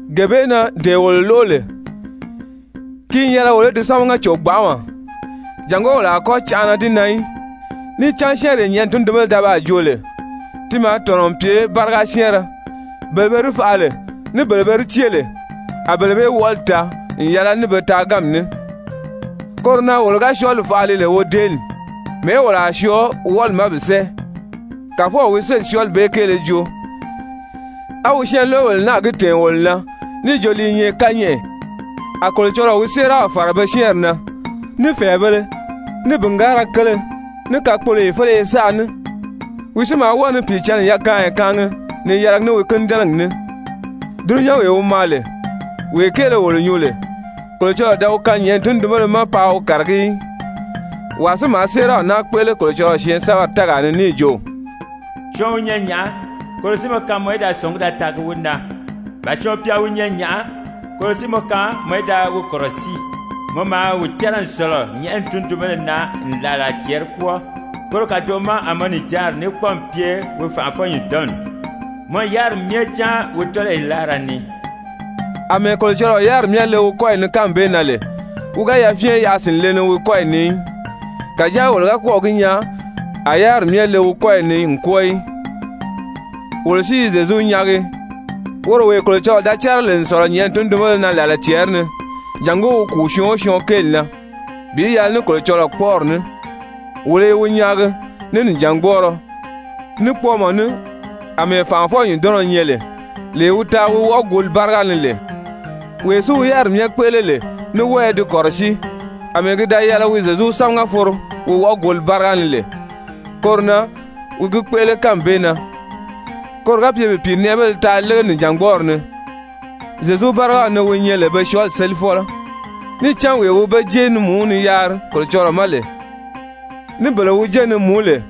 Gee bee na dee wolo lóʔo lè, ki n yɛlɛ wolo í di sámaga cò gbanʔama, jàngó wolo a kɔ́ canʔana di na í. Níì cán syɛ́ɛnree nyɛ̀ʔɛni tundunbéle da baa joo lè, ti maa tɔ̀nɔ n pye báriga syɛ́ɛnrɛ, bele be di faʔa lè, ní bele be di cée lè, a bele bee wɔʔɔli taa n yɛlɛ ní be taaganmi ní, koro na wolo ga syɔɔli faʔa li lè wodeeli, mɛ̀ɛ́ wolo a syɔɔ wɔʔɔli ma bi sɛ́ɛ? Kàfɔw wi sélì syɔɔli bee kéele joo, á wi syɛɛnloʔobèle náà gi tɛ̀ɛn wolo na níì jo li i nyɛ kányɛʔɛ. A Kolocɔlɔɔ wi séeraw fàra be syɛ́ɛnri na, ní fɛ̀ɛbēle, ní bìngaara kele, ní kakpoloyo féleye saʔa ní, wi si maa wɔ́ɔ ni Pìicǎnni yakaanya kaangi ni yɛlɛgi ní wi kínidɛnɛgi ní. Dulunyanwee wi maa lè, wee kéele wolo nyuu lè, Kolocɔlɔɔ da wi kaan nyɛ̀ʔɛni tundunbéle ma paa wi kàragí í. Wàa si maa séeraw naa kpéʔele Kolocɔlɔɔ syɛɛnsɛbɛri tɛ́ɛgaa ni níì jo: «Syɔɔn wi nyɛ nyàʔá, koro si mɔ kaan mɔ í da sɔ̀ngí da taagi wi na? Ba syɔɔn pya wi nyɛ nyàʔá, koro si mɔ kaan mɔ í da wi kɔ̀rɔsíi? Mɔ maa wi cɛ́rɛ n sɔ̀lɔ nyɛ̀ʔɛni tundunbéle na n làla cɛɛri kwɔ́ɔ, koro kàdoʔo ma a mɔ nijanri ní kpɔ́ɔmi pye wi fànʔafɔ-nyùndɔnni. Mɔ n yáriri myɛ cáan wi tɔ́lɔyi láara ni.» Amɛɛ Kolocɔlɔɔ yáriri myɛ le wi kɔ́yi ni kánmi bee na lè wi ga yafyɛn yaʔa sìnle wi kɔ́yi ni í. Kàjáa wolo ga kɔ́ɔ̀ gi nyaa a yáriri myɛ le wi kɔ́yi ni n kwɔ́ɔ í. Wolo si i Zyezu nyaagi, woro wee Kolocɔlɔɔ da cɛ́rɛ lè n sɔ̀lɔ nyɛ̀ʔɛni tundunbéle na làla cɛɛri ni, jàngó wi kùu syɔɔn o syɔɔn kéeli na bi yɛlɛ ní Kolocɔlɔɔ kpɔ́ʔɔri ní. Wolo i wi nyaagi ní nìjangbɔɔrɔ, ní kpɔɔmɔ ní àmɛɛ fànʔafɔ-nyùndɔnnɔ nyɛ lè, lee wi taa wi wɔʔɔguuli báriga ni lè. Wee si wi yáriri myɛ kpéʔele lè ní wɔ́ɔ i di kɔ̀rɔsíi, àmɛɛ ki da yɛlɛ wi Zyezu sámaga foro wɔʔɔguuli báriga ni lè, koro na wi gi kpéʔele kánmi bee na koro ga pye bi pìinɛʔɛbéle taa lége nìjangbɔɔri ni, Zyezu bárigaw ni wi nyɛ lè be syɔɔli sélifɔlɔ. Níì cán wee wi be jé ni mùú ni yaari Kolocɔlɔɔ ma lè, ní bele wi jé ni mùú lè,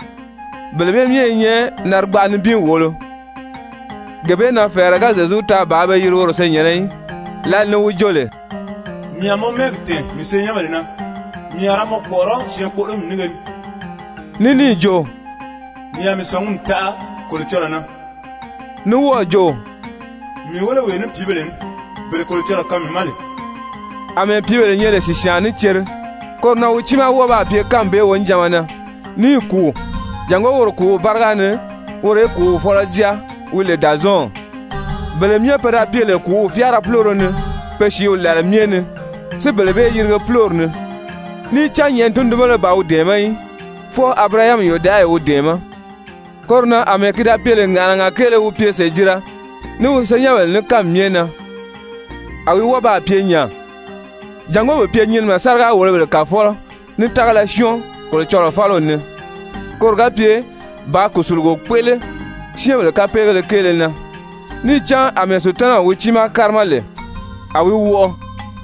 bele bee myɛ i nyɛ narigbaʔa nibin wòolo. Gee bee na fɛ̀ɛrɛ ga Zyezu taa bàā be yiri woro senyɛ̀nnɛ í, lǎli ni wi joo lè: «Mii a mɔ mɛ́ɛgi tɛ̀ɛn mii senyɛnbèle na, mii a ra mɔ kpɔ̀ʔɔrɔ́ syɛɛnkpoʔolomi nínge ni.» Ní níì jo: «Mii a mii sɔ̀ngumi taʔa Kolocɔlɔɔ na.» Ní wɔ́ɔ̀ jo: «Mii wéle wee ní pìíbèle ní, bele Kolocɔlɔɔ kaan mii ma lè.» Amɛɛ pìíbèle nyɛ lè sìsyaan ní cere, koro na wi tiimaa wɔ́ɔ baa pye kánmi bee wonijanma na, níì kùu jàngó woro kùúw báriga ni woro í kùúw fɔ́lɔ jáa wi lè Dàzɔɔnw, bele myɛ pe da pye lè kùúw fyáara púloro ni pe sìíw làla myɛ ni, si bele bee yirige púlori ni. Níì cán nyɛ̀ʔɛni tundunbéle ban wi dɛ̀ɛmɛ́ í, fwɔɔ Abirahami yòdaʔayi wi dɛ̀ɛmɛ́. Koro na àmɛɛ ki da pye lè ŋàʔanaga kéele wi pye sèjira ní wi senyɛnbèle ní kánmi myɛ na, a wi wɔ́ɔ baa pye nya, jàngó bi pye nyinimɛ sáriga-wòlobèle kàfɔlɔ ní tágala syɔ́ɔn Kolocɔlɔɔ fáliw ni, koro ga pye bàā kùsulugo kpéʔele syɛ́ɛnbèle kapeegéle kéele na. Níì cán àmɛɛ Sutanaw wi tiimaw kárima lè a wi wɔʔɔ,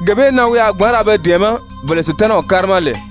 gee bee na wi a gbǎn ra be dɛ̀ɛmɛ́ bele Sutanaw kárima lè.